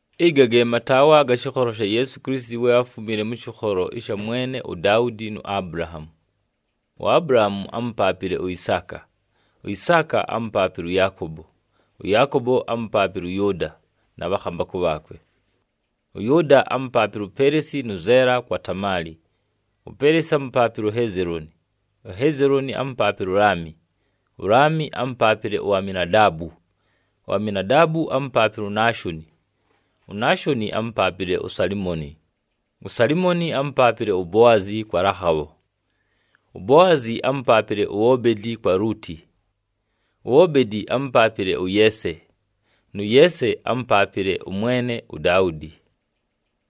Ɨga ge mataawa aga shɨkholo sha Yeesu Kilisiti we áfumile mʉ shɨkholo sha mwene uDaudi nu Abulahaamu. UAbulahaamu ámupaapile uIsaaka, uIsaaka ámupaapile ʉYaakobo, ʉYaakobo ámupaapile ʉYʉʉda na bhakhambakʉ bhaakwe. ɄYʉʉda ámupaapile uPeleesi nʉ Zeela kwa Tamaali. UPeleesi ámupaapile uHezelooni, uHezelooni ámupaapile uLaami, uLaami ámupaapile uAminadaabu, uAminadaabu ámupaapile uNaashoni, uNaashoni ámupaapile uSalimoni, uSalimoni ámupaapile uBoazi kwa Lakhabho, uBoazi ámupaapile uObedi kwa Lʉʉtɨ, uObedi ámupaapile ʉYeese, nʉ Yeese ámupaapile ʉmwene uDaudi.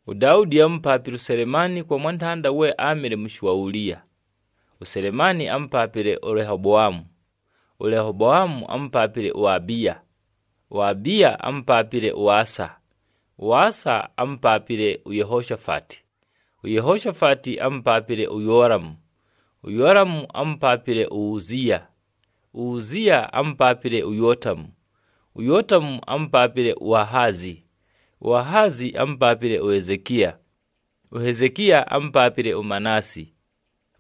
UDaudi ámupaapile uSelemaani kwa mwantanda we áamɨle mʉshɨ wa Uliya. USelemaani ámupaapile uLehoboamu, uLehoboamu ámupaapile uAbiya, uAbiya ámupaapile ʉAsa, ʉAsa ámupaapile uYehoshafati, uYehoshafati ámupaapile uYoolamu, uYoolamu ámupaapile uUziiya, uUziiya ámupaapile uYootamu, uYootamu ámupaapile uAhazi, uAhazi ámupaapile uHezekiya, uHezekiya ámupaapile uManaasi,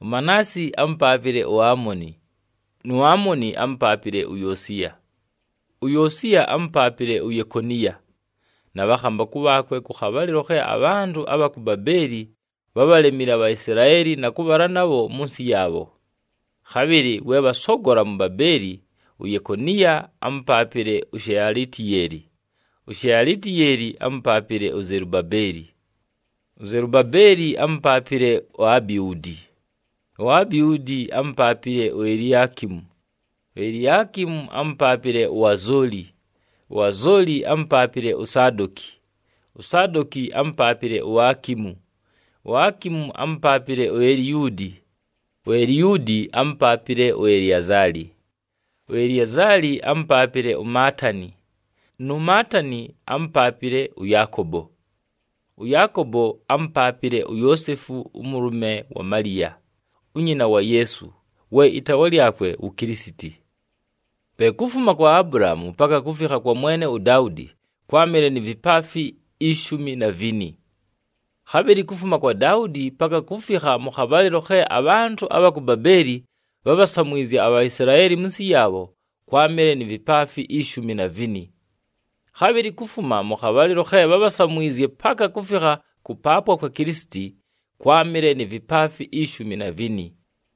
uManaasi ámupaapile uAmoni, nu Amoni ámupaapile uYoosiya. UYoosiya ámupaapile uYekoniya na bhakhambakʉ bhaakwe kʉ khabhalɨlo khe abhantʉ abha ku Babeeli bhábhalemile aBhaisilaeli na kʉbhala nabho mʉ nsɨ yaabho. Khabhɨlɨ we bhasogola mu Babeeli, uYekoniya ámupaapile uShealitiyeeli, uShealitiyeeli ámupaapile uZelubabeli, uZelubabeli ámupaapile uAbihuudi, uAbihuudi ámupaapile uEliakimu, uEliakimu ámupaapile uAzooli uAzooli ámupaapile uSadoki, uSadoki ámupaapile uAkimu, uAkimu ámupaapile uEliyuudi, uEliyuudi ámupaapile uEliazali, uEliazali ámupaapile uMaatani, nu Maatani ámupaapile ʉYaakobo. ɄYaakobo ámupaapile uYoosefu ʉmʉlʉme wa Maliya, unyina wa Yeesu, we ɨtaawa lyakwe wu Kilisiti. Pe kufuma kwa Abulahaamu paka kufikha kwa mwene uDaudi kwámɨle ni vipaafi ishumi na vini. Khabhɨlɨ kufuma kwa Daudi paka kufikha mʉ khabhalɨlo khe abhantʉ abha ku Babeeli bhábhasamwizye aBhaisilaeli mʉ nsɨ yaabho, kwámɨle ni vipaafi ishumi na vini. Khabhɨlɨ kufuma mʉ khabhalɨlo khe bhábhasamwizye paka kufikha kʉpaapwa kwa Kilisiti, kwámɨle ni vipaafi ishumi na vini.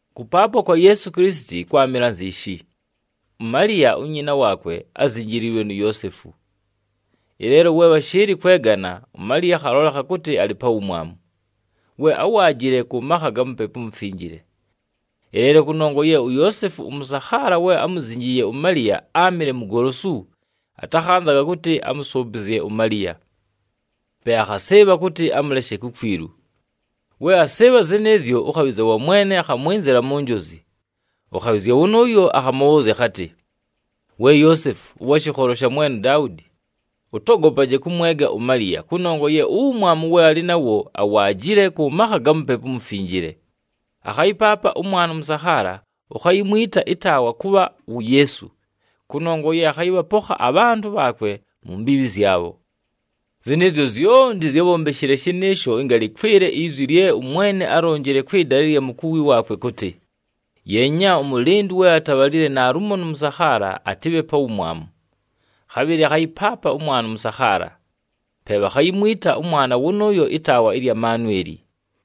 Kʉpaapwa kwa Yeesu Kilisiti kwámɨle anziishi: uMaliya unyina waakwe ázinjiliilwe nu Yoosefu. Ɨleelo we bhashɨɨlɨ kwegana, uMaliya akhalolekha kʉtɨ alɨ pa wumwamu, we áwaajile kʉ makha ga Mupepu uMufinjile. Ɨleelo kʉnongwa ye uYoosefu, ʉmʉsakhaala we ámuzinjiiye uMaliya áamɨle mugolosu, atakhanzaga kʉtɨ amʉsʉʉpɨzye uMaliya. Pe akhasɨɨbha kʉtɨ amʉleshe kukwilu. We asɨɨbha zɨnɨɨzyo, ʉkhabhɨzya wa Mwene akhamwɨnzɨla mu njozi. Ʉkhabhɨzya wʉnʉʉyo akhamʉbhʉʉzya akhatɨ, “We Yoosefu, ʉwa shɨkholo sha mwene uDaudi, ʉtogopaje kʉmwega uMaliya, kʉnongwa ye uwumwamu we alɨ nawo awaajile kʉ makha ga Mupepu uMufinjile. Akhayɨpaapa ʉmwana ʉmʉsakhaala, ukhayimwita ɨtaawa kʉbha wu Yeesu, kʉnongwa ye akhayɨbhapokha abhantʉ bhaakwe mu mbiibhi zyabho.” Zɨnɨɨzyo zyonti zyábhombeshile shɨnɨɨsho ɨnga lɨkwɨle izwi lye ʉMwene álilonjile kwɨ dala ɨlya mukuwi waakwe kʉtɨ, “Yeenya! Ʉmʉlɨndʉ we atabhalile naalumo nʉ mʉsakhaala, atɨbhe pa wumwamu. Khabhɨlɨ akhayɨpaapa ʉmwana ʉmʉsakhaala! Pe bhakhayimwita ʉmwana wʉnʉʉyo ɨtaawa ɨlya Manweli.”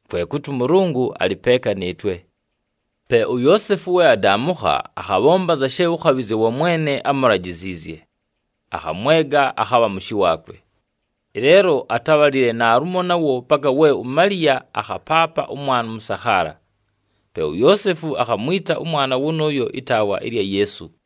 Kwe kʉtɨ, “ɄMʉlʉngʉ alɨ peeka nɨɨtwe.” Pe uYoosefu we adaamʉkha, akhabhomba anza she ʉkhabhɨzya wa Mwene ámulajiziizye, akhamwega akhabha mʉshɨ waakwe. Ɨleelo atábhalile naalumo nawo paka we uMaliya akhapaapa ʉmwana ʉmʉsakhaala. Pe uYoosefu akhamwita ʉmwana wʉnʉʉyo ɨtaawa ɨlya Yeesu.